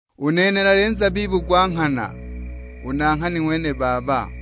"U nene nali Nzabibu gwa nghana, u Nanghani nuulu: Nimi.'ng'wene Baba.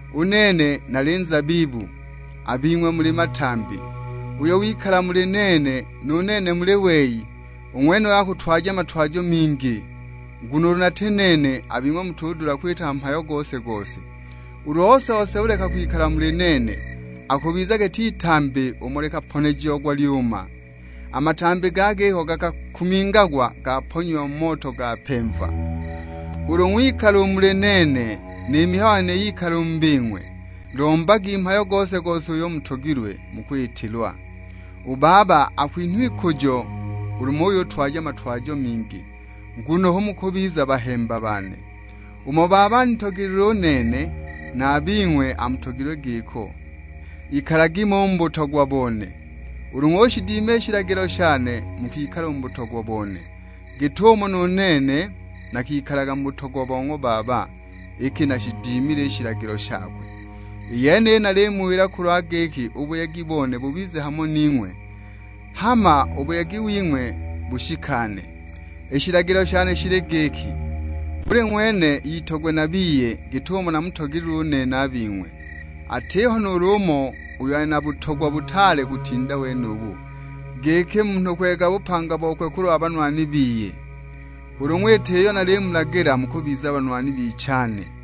U nene nali Nzabibu, a bing'we muli matambi. Uyo wikala muli nene nu nene muli wei, u ng'wenuyo akutwaja matwajo mingi. Nguno ulu nati nene a bing'we mutudula kwita mhayo gose-gose. Ulu ose-ose uleka kwikala muli nene, akubiza giti itambi umo likaponejiagwa, lyuuma. A matambi ga giko gakakumingagwa gaponyiwa mu moto gapemva. Ulu ng'wikala u muli nene ni mihayo yane yikala u mu bing'we, lombagi mhayo gose-gose uyo mutogilwe, mukwitilwa. U Baba akwinhwa ikujo ulu muyutwaja matwajo mingi, nguno hu mukubiza bahemba bane. Umo Baba anitogelilwe u nene, na a bing'we amutogilwe giko. Ikalagi mo u mu butogwa bone. Ulu ng'ushidima i shilagilo shane mukwikala u mu butogwa bone, git'umo nu nene nakikalaga mu butogwa bo ng'wa Baba, iki nashidimile i shilagilo shakwe. I yeniyi nalimuwila kulwa giki u buyegi bone bubize hamo ning'we; hama u buyegi wing'we bushikane. I shilagilo shane shili giki, buli ng'wene itogwe na biye, git'umo namutogelilwe u nene a bing'we. Atiho nuulu umo uyo ali na butogwa butaale kutinda wenubu, giki munhu kweega bupanga bokwe kulwa banwani biye. Ulu ng'wita iyo nalimulagila mukubiza banwani bichane.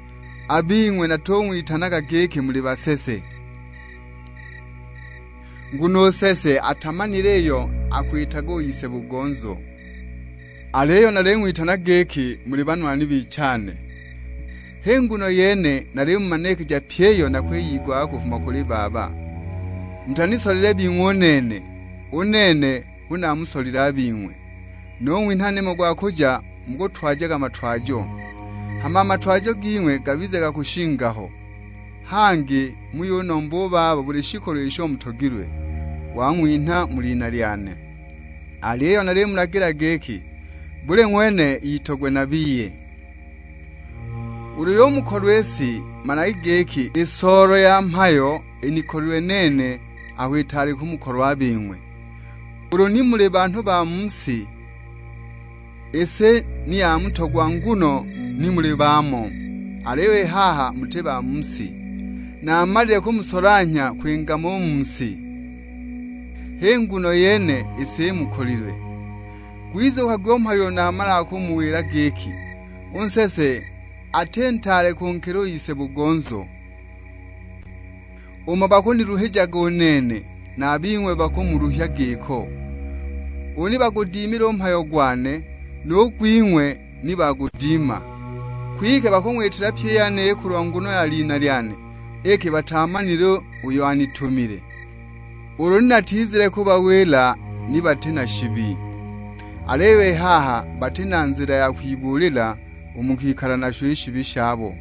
A bing'we natung'witanaga giki muli basese, nguno u nsese atamanile iyo akwitaga u ise-bugonzo; aliyo naling'witana giki muli banwani bichane, h'i nguno yene nalimumanikija pyi iyo nakwiyigwaga kufuma kuli Baba. Mutanisolile bing'we u nene, u nene hu namusolile a bing'we, nung'winha nimo gwa kuja mukutwajaga matwajo. Hama a matwajo ging'we gabize ga kushinga ho, hangi muyunomba u Baba buli shikolo isho mutogilwe, wang'winha mu lina lyane. Aliyo nalimulagila giki, buli ng'wene itogwe na biye." "Ulu yumukolwa i si, managi giki, i soolo ya mhayo inikolilwe nene aho itaali kumukolwa a bing'we. Ulu ni muli ba mu si, i si ni yamutogwa nguno ni muli baamo; aliyo i haha muti ba mu si, naamalile kumusolanhya kwinga mo u mu si, h'i nguno yene i si imukolilwe. Gwizukagwi u mhayo uyo namalaga kumuwila; giki, 'U nsese ati ntaale kunkila u ise-bugonzo.' Umo bakuniluhijaga u nene, na a bing'we bakumuluhya giko, ulu ni bagudimile u mhayo gwane, nu gwing'we ni bagudima. Kwike bakung'witila pyi i yeniyi kulwa nguno ya lina lyane iki bataamanile uyo anitumile. Ulu ni natizile kubawila ni bati na shibi, aliyo i haha bati na nzila ya kwibuulila, u mu kwikala nasho i shibi shabo.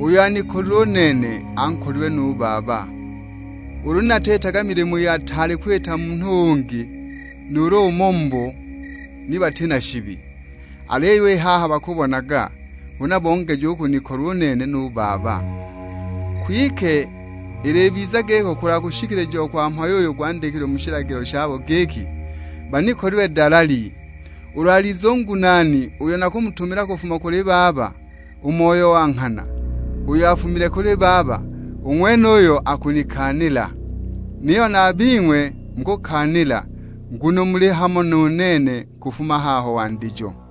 Uyo anikolilwe u nene, ankolilwe nu Baba. Ulu ni natiitaga milimo iyo ataali kwita munhu ungi nuulu umo mubo, ni bati na shibi; aliyo i haha bakubonaga, huna bongeja u kunikolwa u nene, nu Baba. Kwike ilibiza giko kulwa kushikilijiwa kwa mhayo uyo gwandikilwe mu shilagilo shabo giki, 'Banikolilwe dalali!' Ulu alize u Ngunaani uyo nakumutumila kufuma kuli Baba, u Moyo wa nghana, uyo afumile kuli Baba, u ng'wenuyo akunikaanila. Niyo na a bing'we mukukaanila, nguno muli hamo nu nene kufuma haho wandijo.